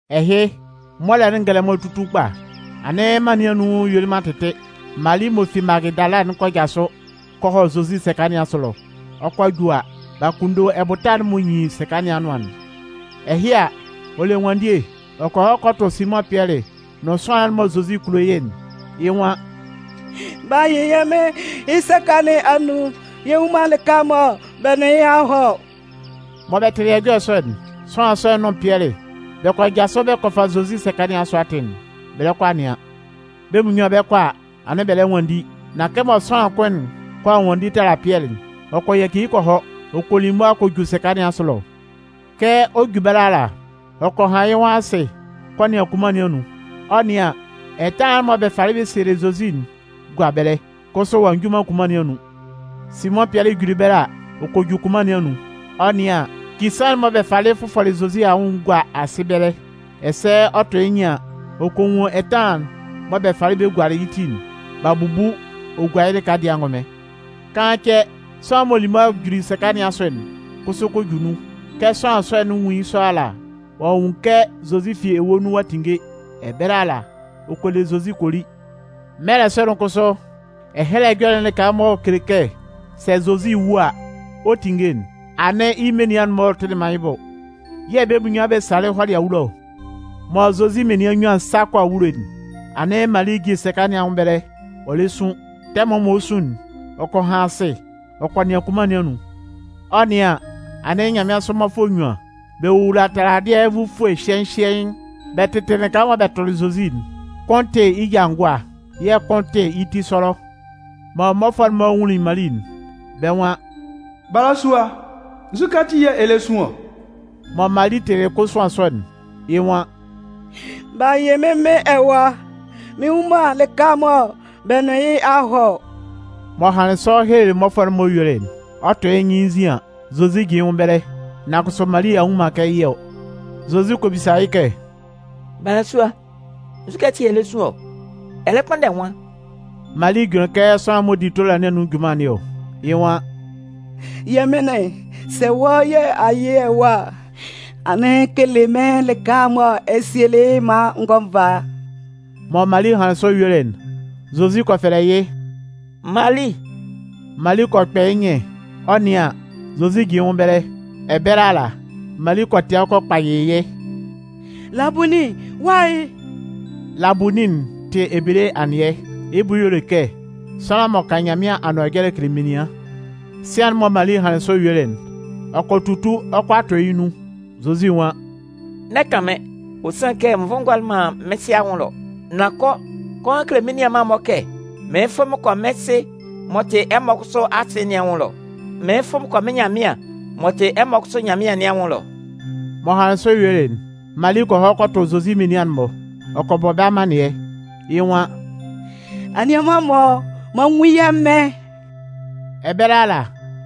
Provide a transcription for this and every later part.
Ɛhɩ, mɔlɛ'n ngɛlɛmɔ tutun kpa, anɩn mân nɩn anun yuelɩ man tɩtɩ, Mali m'ɔ fi Magɩdala'n kɔ jasʋ kɔ hɔ Zozi sɛka nɩn asʋ ɛlɔ. Ɔ 'kɔ a ju a, b'a kunndo ɛbʋta'n m'ɔ nyin sɛka nɩn anʋan'n. Ɛhɩ a, ɔ le ɛnwanndie ɔ kɔ hɔ kɔ tʋ Simʋn Pɩɛlɩ nʋn sʋanlan'n mɔ Zozi kulo yɩ́'n, yɩ́ nwan: “B'a yɩ yɛ́ Mɩn yɩ́ sɛka nɩn anun, yɛ nnwun man lɩka mɔ bɛ nʋn yɩ́ a hɔ ɔ.” Mɔ bɛ tɩlɩ ɛjɔlɛ sɔ'n, sʋanlan sɔ'n nʋn Pɩɛlɩ, bɛ kɔ jasʋ bɛ kɔ fa Zozi sɛka nɩn asʋ atɩn'n, bɛ lɛ kɔ a nɩan. Bɛ́ munnyuan bɛ 'kɔ a, anɩn bɛ lɛ nwanndi. Nan kɛmɔ sʋanlan kʋn'n kʋala nwanndi tala Pɩɛlɩ'n, ɔ kɔ yaci yɩ́ kɔ hɔ, ɔ kɔ li mʋa kɔ ju sɛka nɩn asʋ ɛlɔ. Kɛ ɔ 'ju ɛbɛlɛ ala, ɔ kɔ han yɩ́ nwʋn asɩ kɔ nɩan kunman nɩn anun. Ɔ 'nɩan an, ɛtanlan'n mɔ bɛ falɩ bɛ sielɩ Zozi'n gua ɛbɛlɛ, kʋsʋ ɔ'a nju man kunman nɩn anun. Simʋn Pɩɛlɩ juli ɛbɛlɛ a, ɔ kɔ ju kunman nɩn anun. Ɔ 'nɩan an, kisaan'n mɔ bɛ falɩ fʋfɔlɩ Zozi anwʋn'n gua asɩ ɛbɛlɛ. Ɛsɛ ɔ 'tʋ yɩ́ nyɩn an, ɔ kɔ nwun ɛtanlan'n mɔ bɛ falɩ gualɩ yɩ́ ti'n, b'a bubu ɔ gua yɩ́ lɩka dɩɛ angʋnmɩn. Kaan cɛ, sʋanlan'n m'ɔ lili mʋa juli sɛka nɩn asʋ'n kʋsʋ kɔ ju nun. Kɛ sʋanlan sɔ'n 'nwun yɩ́ sɔ ala, ɔ'a nwun kɛ Zozi fi ewue nun ɔ'a tinnge. Ɛbɛlɛ ala, ɔ kɔ le Zozi kɔ li. (Mɛlɛ sɔ'n kʋsʋ, Ɛhɛlɛ Ɛjɔlɛ'n lɩka'n m'ɔ kele kɛ sɛ Zozi wu a, ɔ 'tinnge'n, anɩn yɩ́ menian'n-mɔ tɩlɩ man yɩ́ bʋ.) Yɛ̂ bɛ́ munnyuan bɛ salɩ hɔlɩ awulo ɔ. Mɔ Zozi menian nnyuan'n 'sa kɔ awulo'n, anɩn Mali jin sɛka nɩn anwʋn ɛbɛlɛ, ɔ lɛ sun. Tɛmʋn mɔ ɔ 'su'n, ɔ kɔ han asɩ ɔ kɔ nɩan kunman nɩn anun. Ɔ 'nɩan an, anɩn nyanmɩansʋ mmɔfʋɛ nnyuan, bɛ wowula taladɩɛ nvufue hyɩhyɩɛɩn, bɛ tɩtɩ lɩka mɔ bɛ tʋlɩ Zozi'n. Kʋn tɩ yɩ́ ja ngʋa yɛ̂ kʋn tɩ yɩ́ ti sɔlɔ. Mɔ mmɔfʋɛ'n-mɔ nwunlin Mali'n, bɛ́ nwan: “Balasua, nzukɛ ati yɛ̂ ɛ lɛ sun ɔ?” Mɔ Mali tɩlɩ kosuan sɔ'n, yɩ́ nwan: “B'a yɩ mɩ́n Mɩn ɛwa, mɩn nnwun man lɩka mɔ bɛ nʋn yɩ́ a hɔ ɔ.” M'ɔ hanlɩn sɔ helelɩ mmɔfʋɛ'n-mɔ yuelɩ'n, Ɔ 'tʋ yɩ́ nyɩn yɩ́ nzin an, Zozi jin yɩ́ nwʋn ɛbɛlɛ, nan kʋsʋ Mali a nnwun man kɛ yɩ́ ɔ. Zozi kɔ bisa yɩ́ kɛ: “Balasua, nzukɛ ati yɛ̂ ɛ lɛ sun ɔ? Ɛ lɛ kpʋnndɛ nwan?” Mali jʋnlɩn kɛ sʋanlan'n m'ɔ di tola nɩn anun junman nɩn ɔ. Yɩ́ nwan: “Yɛmɩnlɩn, sɛ wɔ́ yɛ̂ a yɩ yɩ́ ɛwa a, anɩn kele mɩ́n lɩka mɔ ɛ sielɩ yɩ́'n maan n gɔ́ n vá.” Mɔ Mali hanlɩn sɔ yuelɩ'n, Zozi kɔ fɛlɛ yɩ́: “Mali!” Mali kɔ kpɛ yɩ́ nyɩn ɔ 'nɩan an, Zozi jin yɩ́ nwʋn ɛbɛlɛ. Ɛbɛlɛ ala, Mali kɔ tɩan kɔ kpayɩ yɩ́: “Labunin, wɔ́ ahɩ?” (Labunin'n tɩ ebele anɩɛ, yɩ́ bʋ y'ɔ le kɛ sʋanlan m'ɔ kan Nyanmɩan anʋan ɛjɔlɛ kele menian.) Sian'n mɔ Mali hanlɩn sɔ yuelɩ'n, ɔ kɔ tutu ɔ 'kɔ a tɔ yɩ́ nun. Zozi nwan: “N'ɛ kan mɩ́n, ɔ sanlɩn kɛ n vʋlɩ n gɔlɩ man mɩ́n Sɩ anwʋn ɛlɔ. Nan kɔ, kɔ han kele mɩ́n menian'n-mɔ kɛ mɩɩn fʋ mɩn kɔ mɩ́n Sɩ m'ɔ tɩ ɛmɔ kʋsʋ Asɩ nɩn anwʋn ɛlɔ, mɩɩn fʋ mɩn kɔ mɩ́n Nyanmɩan m'ɔ tɩ ɛmɔ kʋsʋ Nyanmɩan nɩn anwʋn ɛlɔ.” M'ɔ hanlɩn sɔ yuelɩ'n, Mali kɔ hɔ kɔ tʋ Zozi menian'n-mɔ, ɔ kɔ bɔ bɛ́ amannɩɛ, yɩ́ nwan: “Anianman-mɔ, m'an nwun yɛ́ Mɩn!” Ɛbɛlɛ ala,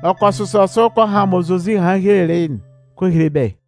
ɔ kɔ sʋsɔ sʋ kɔ han mɔ Zozi hanlɩn helelɩ yɩ́'n kɔ hele bɛ́.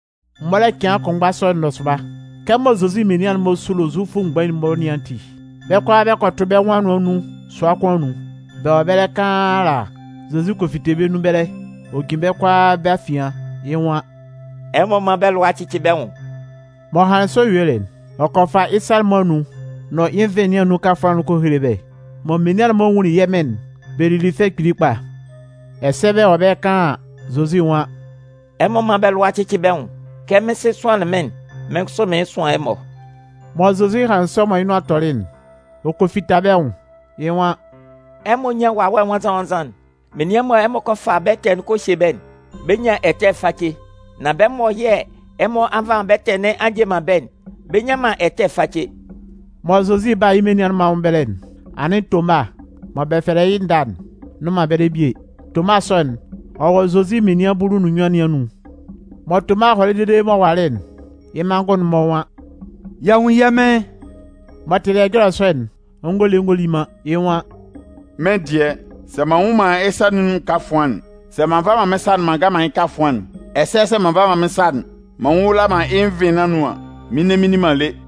Mɔlɛ cɩan kʋnmgba sɔ'n nɔsʋba, kɛmɔ Zozi menian'n-mɔ sulo Zufʋ mgbain'n-mɔ nɩn ati, bɛ́ kʋalaa bɛ kɔ tʋ bɛ́ nwʋn anʋan nun sua kʋn anun. Bɛ wɔ ɛbɛlɛ kaan ala, Zozi kɔ fite bɛ́ nun ɛbɛlɛ, ɔ jin bɛ́ kʋalaa bɛ́ afian, yɩ́ nwan: “Ɛmɔ mán bɛ́ lʋa cɩ́cɩ bɛ́ nwʋn!” M'ɔ hanlɩn sɔ yuelɩ'n, ɔ kɔ fa yɩ́ sa'n-mɔ anun nʋn yɩ́ nvɩn nɩn anun kafʋan'n kɔ hele bɛ́. Mɔ menian'n-mɔ nwunlin yɛ́ Mɩn'n, bɛ lili fɛ kpili kpa. Ɛsɛ bɛ wɔ ɛbɛlɛ kaan an, Zozi nwan: “Ɛmɔ mán bɛ́ lʋa cɩcɩ bɛ́ nwʋn! Kɛ mɩ́n Sɩ sʋanlɩn mɩ́n'n, mɩ́n kʋsʋ mɩɩn sʋan ɛmɔ.” Mɔ Zozi hanlɩn sɔ mɔ yɩ́ nʋan tɔlɩ'n, ɔ kɔ fita bɛ́ nwʋn, yɩ́ nwan: “Ɛmɔ nyán Wawɛ Nwannzan-nwannzan'n. Menian mɔ ɛmɔ kɔ fa bɛ́ ɛtɛ'n kɔ hye bɛ́'n, bɛ 'nyan ɛtɛ face, nan bɛ́ mɔ yɛ̂ ɛmɔ a nva man bɛ́ ɛtɛ nɩn a nje man bɛ́'n, bɛ nnyan man ɛtɛ face.” Mɔ Zozi 'ba yɩ́ menian'n-mɔ anwʋn ɛbɛlɛ'n, anɩn Toma (mɔ bɛ fɛlɛ yɩ́ Nda'n) nnʋn man ɛbɛlɛ bie. Toma sɔ'n, ɔ wɔ Zozi menian bulu nʋn nnyuan nɩn anun. Mɔ Toma hɔlɩ dede m'ɔ walɩ'n, yɩ́ manngʋn'n-mɔ nwan: “Y'a nwun yɛ́ Mɩn!” M'ɔ tɩlɩ ɛjɔlɛ sɔ'n, ɔ ngɔ le ngɔ li man, yɩ́ nwan: “Mɩ́n dɩɛ, sɛ m'an nnwun man yɩ́ sa nɩn anun kafʋan'n, sɛ m'an nva man mɩ́n sa'n m'an ngan man yɩ́ kafʋan'n, ɛsɛ sɛ m'an nva man mɩ́n sa'n m'an nwula man yɩ́ nvɩn nɩn anun an, mɩn nne mɩn nni man lé.”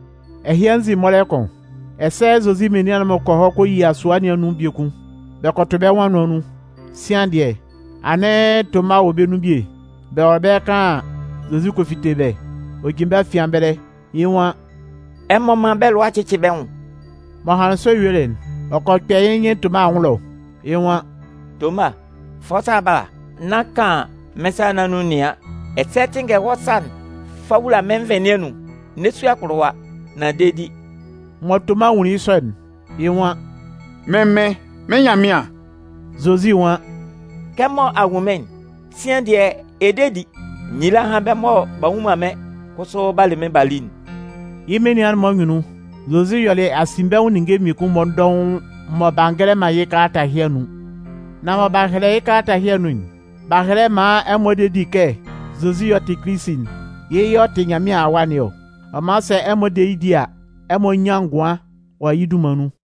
Ɛhɩ anzin mɔlɛ kʋn, ɛsɛ Zozi menian'n-mɔ kɔ hɔ kɔ yia sua sɔ nɩn anun biekun, bɛ kɔ tʋ bɛ́ nwʋn anʋan nun. Sian dɩɛ, anɩn Toma wɔ bɛ́ nun ɛbɛlɛ bie. Bɛ wɔ ɛbɛlɛ kaan an, Zozi kɔ fite bɛ́, ɔ jin bɛ́ afian ɛbɛlɛ. Yɩ́ nwan: “Ɛmɔ mán bɛ́ lʋa cɩ́cɩ bɛ́ nwʋn!” M'ɔ hanlɩn sɔ yuelɩ'n, ɔ kɔ kpɛ yɩ́ nyɩn Toma anwʋn ɛlɔ, yɩ́ nwan: “Toma, fa wɔ́ sa'n bala nán kan mɩ́n sa nɩn anun nɩan, ɛsɛ tɩnngɛ wɔ́ sa'n fa wula mɩ́n nvɩn nɩn anun. N'ɛ su akpʋlʋwa, nan de di.” Mɔ Toma nwunlin yɩ́ sɔ'n, yɩ́ nwan: “Mɩ́n Mɩn, mɩ́n Nyanmɩan!” Zozi nwan: “Kɛmɔ a nwun mɩ́n'n, sian dɩɛ, ɛ de di? Nyila hán bɛ́ mɔ b'a nnwun man mɩ́n kʋsʋ b'a le mɩ́n b'a li'n.” Yɩ́ menian'n-mɔ anyunnun, Zozi yɔlɩ asinbɛnwʋn ninnge mmiekun-mɔ dɔʋn mɔ b'a ngɛlɛ man yɩ́ kalata ɛhɩ anun. Nan mɔ b'a hɛlɛ yɩ́ kalata ɛhɩ anun'n, b'a hɛlɛ maan ɛmɔ de di kɛ Zozi yɛ̂ ɔ tɩ Kilisi'n, yɩ́ yɛ̂ ɔ tɩ Nyanmɩan Awa nɩn ɔ. Ɔ man sɛ ɛmɔ de yɩ́ di a, ɛmɔ 'nyan ngʋan wɔ yɩ́ dunman nun.